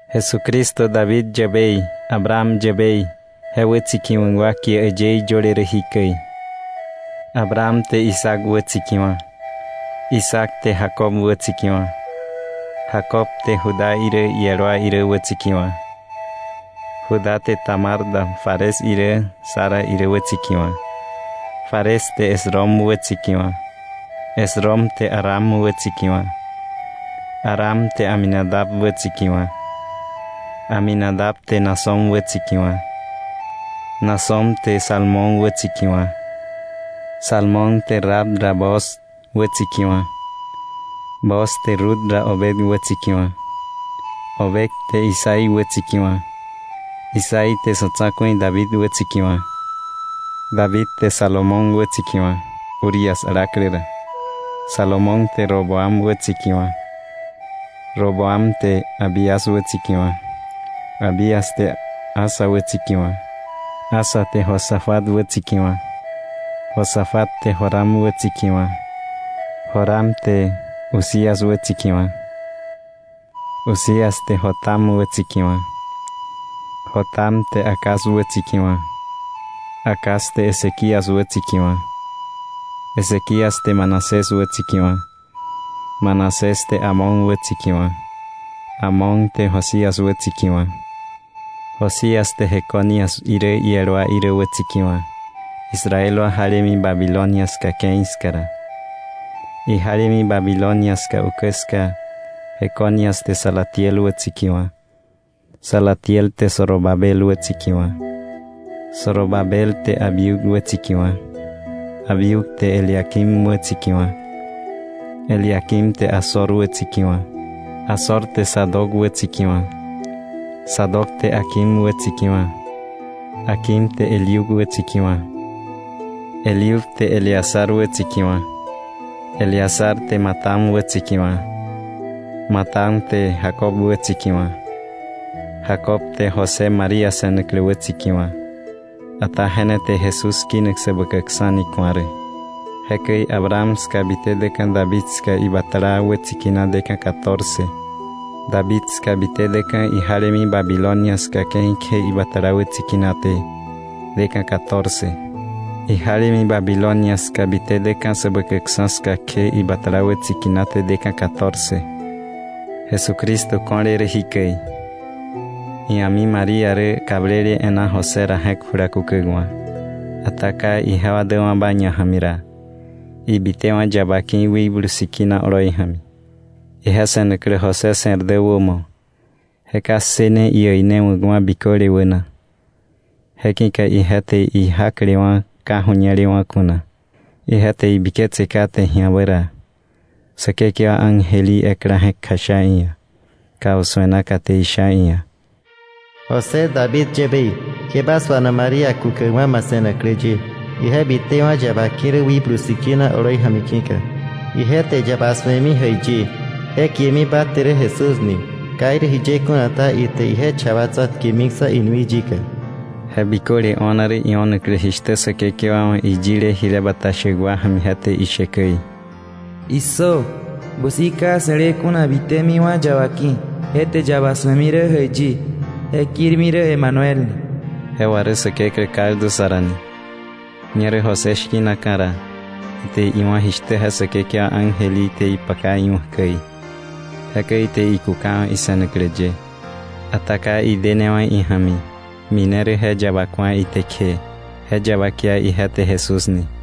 Jesucristo David yäbei, Abraham yäbei, je wätsikiwa̱k wa kie äyëí yöle rä jikäi: Abraham te Isaac wätsikiwa̱, Isaac te Jacob wätsikiwa̱, Jacob te Judá irä iel wa irä wätsikiwa̱. Judá te Tamar da Fares irä Zara irä wätsikiwa̱. Fares te Esrom wätsikiwa̱, Esrom te Aram wätsikiwa̱. Aram te Aminadab wätsikiwa̱, Aminadab te Naasón wätsikiwa̱, Naasón te Salmón wätsikiwa̱. Salmón te Rahab ra Booz wätsikiwa̱. Booz te Rut da Obed wätsikiwa̱. Obed te Isaí wätsikiwa̱. Isaí te sa̱ tsa̱ku̱i David wätsikiwa̱. David te Salomón wätsikiwa̱, Urías alaklä ra. Salomón te Roboam wätsikiwa̱, Roboam te Abías wätsikiwa̱, Abías te Asa wätsikiwa̱. Asa te Josafat wätsikiwa̱, Josafat te Joram wätsikiwa̱, Joram te Uzías wätsikiwa̱. Uzías te Jotam wätsikiwa̱, Jotam te Acaz wätsikiwa̱, Acaz te Ezequías wätsikiwa̱. Ezequías te Manasés wätsikiwa̱, Manasés te Amón wätsikiwa̱, Amón te Josías wätsikiwa̱. Josías te Jeconías irä iel wa irä wätsikiwa̱, Israel wa jalemi Babilonia ska ke̱i ska ra. Ijalemi Babilonia ska ukä ska Jeconías te Salatiel wätsikiwa̱. Salatiel te Zorobabel wätsikiwa̱. Zorobabel te Abiud wätsikiwa̱, Abiud te Eliaquim wätsikiwa̱, Eliaquim te Azor wätsikiwa̱. Azor te Sadoc wätsikiwa̱, Sadoc te Aquim wätsikiwa̱, Aquim te Eliud wätsikiwa̱. Eliud te Eleazar wätsikiwa̱, Eleazar te Matán wätsikiwa̱, Matán te Jacob wätsikiwa̱. Jacob te José, María se̱naklä, wätsikiwa̱, ata je ne te Jesús kinak Säbäkäkksa̱ ni ku̱a rä. Jekäi Abraham ska bite däka̱ David ska ibatala wätsikinaté deka̱ catorce. David ska bite däka̱ ijalemi Babilonia ska ke̱i kje ibatala wätsikinaté deka̱ catorce. Ijalemi Babilonia ska bite däka̱ Säbäkäkksa̱ ska kje, ibatala wätsikinaté deka̱ catorce. Jesucristo ko̱le rä jikäi: Ia̱mi María rä kablele e̱ná José ra je̱k jula kukäkwa̱. Ata ka ijewa däwa̱ba ñaja̱mi ra, ibitewa̱ yaba ki̱ Wikblu Sikina oloi ja̱mi. Ije se̱naklä José se̱r dä wämo, je ka ssëne iäinewa̱kwa̱ biköle wäna, je ki̱ka ije te ijaklewa̱ ka ju̱ñelewa̱ kuna. Ije te ibiketse kate ji̱abä ra, Säkekewa ángel í ekla je̱k kjasha iia̱ kausu̱e naka, te isha iia̱: “José, David yäbei, ke ba suana María kukäkwa̱ ma se̱naklä ye, ije bitewa̱ yaba ki̱ rä Wikblu Sikina oloi ja̱mi ki̱ka. Ije te yaba su̱emi jäiyi, je kiemi ba te rä Jesús ni. Ka irä jiye kuna ta, ite ije cha wa tsa̱tkemiksa̱ inui yika.” Je biköle o̱na rä io̱naklä jishtä Säkekewa wa̱ iyile jile bata shäk ja̱mi je te ishe käi: “¡Issö! Busi ka se̱le kuna bitämiwa̱ yaba ki̱, je te yaba su̱emi rä jäiyi, je kirmi rä Emanuel” ni. (Je wà rä “Säkeklä kaldu sa ra” ni.) Ñerä José shki̱naka̱ ra, ite iwá̱ jishtä je Säkekewa ángel í te ipaka iwa̱k käi. Jekäi ite ikukawa̱ ise̱naklä ye. Ata ka idenewa̱ ija̱mi, mine rä je yaba ku̱a ite kje, je yaba kia ije te Jesús ni.